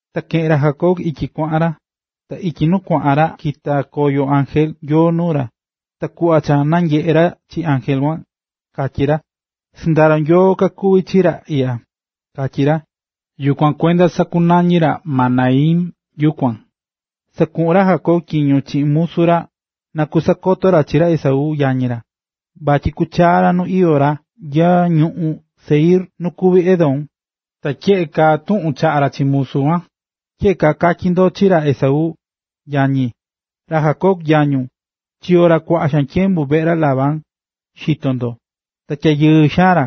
Ta keꞌe̱n ra Jacob ityi kuaꞌan ra. Ta ityi nu kuaꞌan ra kita̱ koyo ángel Nyoo nuu ra. Ta kuꞌva cha nanyeꞌe̱ ra chi ángel kuan, katyí ra: “Sɨndaro Nyoo kakuví chi ra iꞌya”, katyí ra. Yukuan kuenda sakunañi̱ ra Mahanaim yukuan. Sakuꞌu̱n ra Jacob tyiño chiꞌin musu ra na kakusakoto ra chi ra Esaú, yañi ra, vatyi kuchaa ra nu iyó ra nya ñuꞌún Seir nu kuví Edom. Ta tyeꞌe kaa tuꞌun chaꞌa̱ ra chi musu kuan: “Tyeꞌe kaa katyi ndo chi ra Esaú, yañi: ‘Ra Jacob, yañun, chiyo̱ ra kuaꞌa xaan tyembu veꞌe ra Labán, xito ndo. Ta tyayɨɨ xaan ra,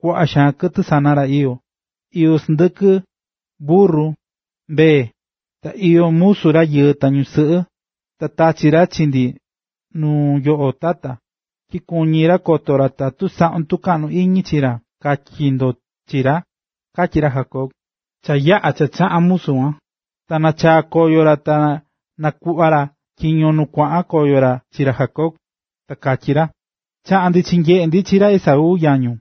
kuaꞌa xaan kɨtɨ sana ra iyó: iyó sɨndɨkɨ, burru, mbee, ta iyó musu ra rayɨɨ ta ñusɨꞌɨ. Ta tachi̱ ra chi ndi nuu yoꞌo tata, tyi kuñí ra koto ra tatu saꞌún tukaꞌnu iñi chi ra’, katyi ndo chi ra”, katyí ra Jacob. Cha yaꞌa̱ cha kachaꞌa̱n musu kuan, ta nachaa̱ koyo ra ta kanakuꞌva̱ ra tyiño nu chaꞌa̱n koyo ra chi ra Jacob, ta katyí ra: ―Chaꞌa̱n ndi chinyeꞌe̱ ndi chi ra Esaú, yañun,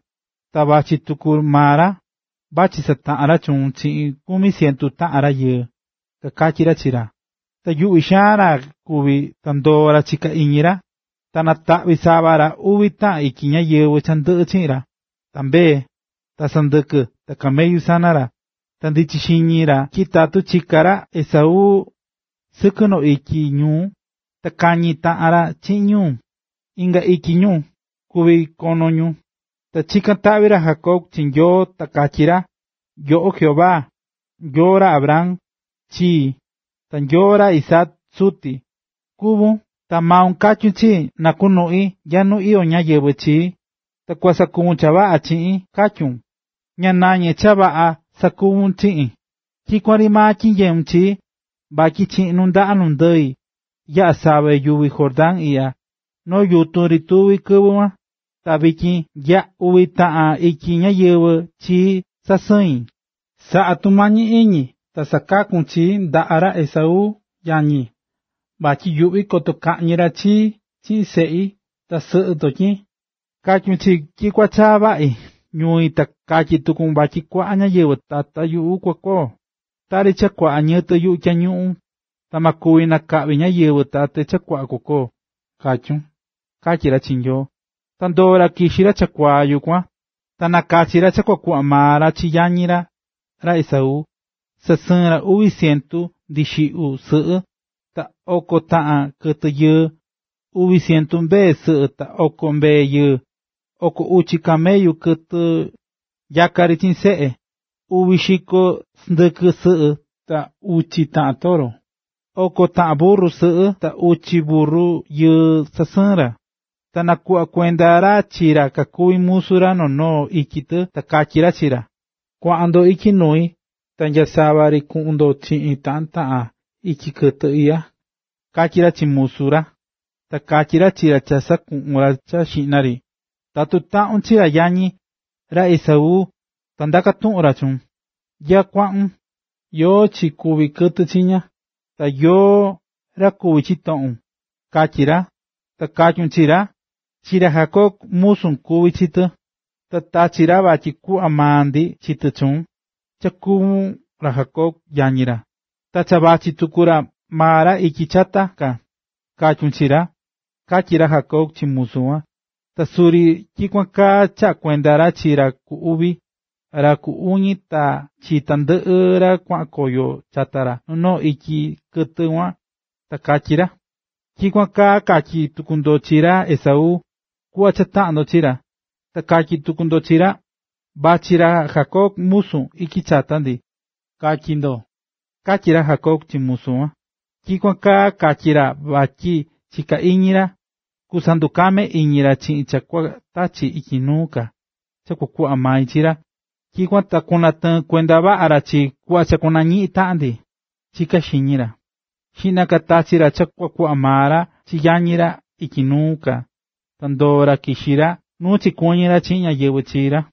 ta vachí tuku maa ra, vachí sataꞌan ra chuun chiꞌin kumi cientu taꞌan rayɨɨ ―kakatyí ra chi ra. Ta yuꞌví xaan ra kuvi̱ ta ndoo̱ ra chiká iñi ra. Ta nataꞌvi̱ sava ra uvi taꞌan ityi ñáyɨvɨ cha ndɨꞌɨ chiꞌin ra, ta mbee ta sɨndɨkɨ ta camellu sana ra. Ta ndichí xiñi ra tyi tatu kichi ra Esaú sɨkɨ noo ityi ñu, ta kañi taꞌan ra chiꞌin ñu, inga ityi ñu kuví kono ñu. Ta chikán taꞌvi ra Jacob chi Nyoo ta katyí ra: “Yoꞌo Jehová, Nyoo ra Abraham, chii, ta Nyoo ra Isaac, suti, kuvún, ta maun katyu̱n chii na kunuꞌi nya ñui nu iyó ñáyɨvɨ chii ta kua sakuvun cha vaꞌa chiꞌin”, katyu̱n. Ña nañé cha vaꞌa xaan sakuvún chiꞌin. Tyikuan ri maa tyinyeún chii, vatyi chiꞌin nundaꞌa nundɨi yaꞌa̱ save yuvi Jordán iꞌya, noo yutun ri tuvi̱ kɨvɨ kuan, ta vityin nya uvi taꞌan ityi ñáyɨvɨ chii sasɨi̱n. Sa̱ꞌa tumañi iñi ta sa̱kaku chi ndi ndaꞌa ra Esaú, yañi, vatyi yuꞌví koto kaꞌñi ra chii chiꞌin seꞌi ta sɨꞌɨ ndotyin. Katyu̱n chii tyi kua chaa vaꞌi ñui ta katyi̱ tukun tyi kuaꞌa ñáyɨvɨ tata yuꞌu kua koo, tari cha kuaꞌa ñiyɨtɨ yuꞌu tyañuꞌun ta ma kuvi nakaꞌvi ñáyɨvɨ tate cha kua koo, katyu̱n”, katyí ra chi Nyoo. Ta ndoo̱ ra kixi̱ ra chakuaa yukuan. Ta nakachi̱ ra cha kua kuꞌva maa ra chi yañi ra, ra Esaú. Sasɨɨ̱n ra uvi cientu ndixiꞌyu sɨꞌɨ, ta oko taꞌan kɨtɨ yɨɨ, uvi cientu mbee sɨꞌɨ ta oko mbee yɨɨ. Oko uchi camellu kɨtɨ nyaká chiꞌin seꞌe, uvi xiko sɨndɨkɨ sɨꞌɨ ta uchi taꞌan toro, oko taꞌan burru sɨꞌɨ ta uchi burru yɨɨ sasɨɨ̱n ra. Ta nakuꞌva̱ kuenda ra chi ra kakuví musu ra noo noo ityi tɨ ta katyí ra chi ra: ―Kuaꞌan ndo ityi nui ta nyasava ri kuꞌun ndo chiꞌin taꞌan taꞌan ityi kɨtɨ iꞌya ―katyí ra chi ra musu ra. Ta katyí ra chi ra cha sakuꞌu̱n ra cha xiꞌna ri: ―Tatu taꞌun chi ra yañi, ra Esaú, ta ndaká tuꞌun ra chuun: “¿Nyá kuaꞌun? ¿Yóó chi kuví kɨtɨ chiña? ¿Ta yóó ra kuví chitoꞌun?”, katyi ra. Ta katyun chi ra: “Chi ra Jacob musun kuví chi tɨ, ta tachi̱ ra vatyi kuꞌva maa ndi chi tɨ chuun, cha kuvún ra Esaú, yañi ra, ta cha vachí tuku maa ra ityi chata ka”, katyun chi ra ―katyí ra Jacob chi musu kuan. Ta suri tyikuan kaa chaꞌa̱ kuenda ra chi ra ku uvi, ra ku uñi ta chi tandɨꞌɨ ra kuaꞌan koyo chata noo noo ityi kɨtɨ kuan. Ta katyí ra: ―Tyikuan kaa katyi tuku ndo chi ra Esaú, kuꞌva cha taꞌan ndo chi ra. Ta katyi tuku ndo chi ra: “Vachí ra Jacob, musun, ityi chata ndi”, katyi ndo ―katyí ra Jacob chi musu ra. Tyikuan kaa katyí ra vatyi chiká iñi ra: “Kusandukame iñi ra chiꞌin cha kua tachi ityi nuu ka, cha kuꞌva mai chi ra, tyikuan ta kunatɨɨn kuenda vaꞌa ra chii kuꞌva cha kunañiꞌin taꞌan ndi”, chiká iñi ra. Xiꞌna ka tachi̱ ra cha kua kuꞌva maa ra chi yañi ra ityi nuu ka, ta ndoo̱ ra kixi̱ ra nu chikuɨñɨ̱ ra chiꞌin ñáyɨvɨ chi ra.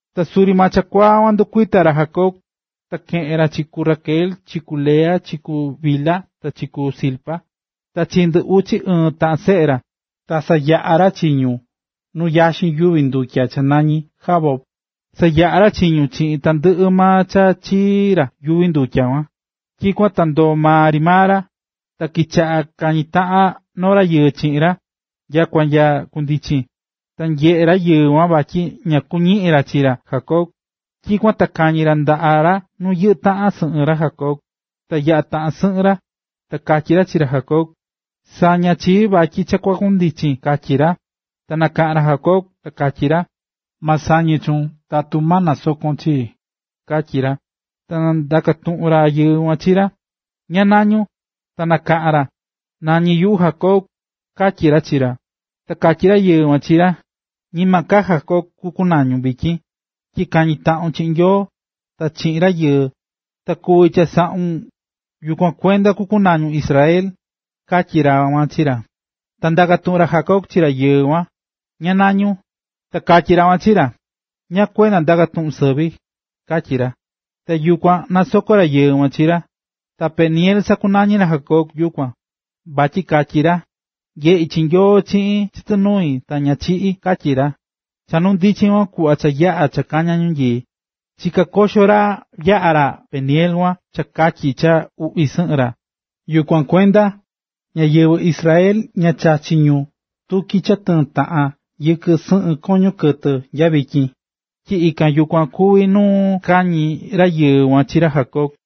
Ta suri maa chakuaa kuan ndukuita̱ ra Jacob, ta keꞌe̱n ra chi ku Raquel, chi ku Lea, chi ku Bilha, ta chi ku Zilpa, ta chi ndɨ uchi ɨɨn taꞌan seꞌe ra, ta sayaꞌa̱ ra chi ñu nu yaxin yuvi ndutya cha nañí Jaboc. Sayaꞌa̱ ra chi ñu chiꞌin tandɨꞌɨ maa cha chii ra yuvi ndutya kuan. Tyikuan ta ndoo̱ maa ri maa ra. Ta kichaꞌa̱ kañí taꞌan noo rayɨɨ chiꞌin ra, nyakua nya kundichin. Ta nyeꞌé rayɨɨ kuan vatyi ña kuñiꞌín ra chi ra Jacob, tyikuan ta kañi̱ ra ndaꞌa ra nu yɨꞌɨ́ taꞌan sɨꞌɨn ra Jacob, ta yaꞌa̱ taꞌan sɨꞌɨn ra. Ta katyí ra chi ra Jacob: ―Sa̱ña chii vatyi cha kua kundichin ―katyí ra. Ta nakaꞌa̱n ra Jacob, ta katyí ra: ―Ma sañe chuun tatu ma nasokon chii ―katyí ra. Ta ndaka̱ tuꞌun rayɨɨ kuan chi ra: ―¿Ñáá nañún? Ta nakaꞌán ra: ―Nañí yuꞌu Jacob ―katyí ra chi ra. Ta katyí rayɨɨ kuan chi ra: ―Ñima ka Jacob kunañun vityin, tyi kañi̱ taꞌun chiꞌin Nyoo, ta chiꞌin rayɨɨ, ta kuvi̱ chasaꞌun, yukuan kuenda kunañun Israel ―katyí ra kuan chi ra. Ta ndaka̱ tuꞌun ra Jacob chi rayɨɨ kuan: ―¿Ñáá nañún? Ta katyí ra kuan chi ra: ―¿Ñáá kuenda ndaká tuꞌun sɨvi? ―katyí ra. Ta yukuan nasoko̱ rayɨɨ kuan chi ra. Ta Peniel sakunañi̱ ra Jacob yukuan. Vatyi katyí ra: “Nyeꞌi̱ chi Nyoo chiꞌin chɨtɨ nui ta ña chiꞌi̱”, katyí ra. Cha kundichi̱n kuan kuꞌva cha yaꞌa̱ kaña̱ ñanyii, chiká koxo ra yaꞌa̱ ra Peniel kuan cha katyi cha uꞌvi sɨꞌɨn ra. Yukuan kuenda, ñáyɨvɨ Israel ña chachí ñu tutyi cha tɨɨ́n taꞌan yɨkɨ sɨꞌɨn koño kɨtɨ nya vityin, tyi ikan yukuan kuví nu kañi̱ rayɨɨ kuan chi ra Jacob.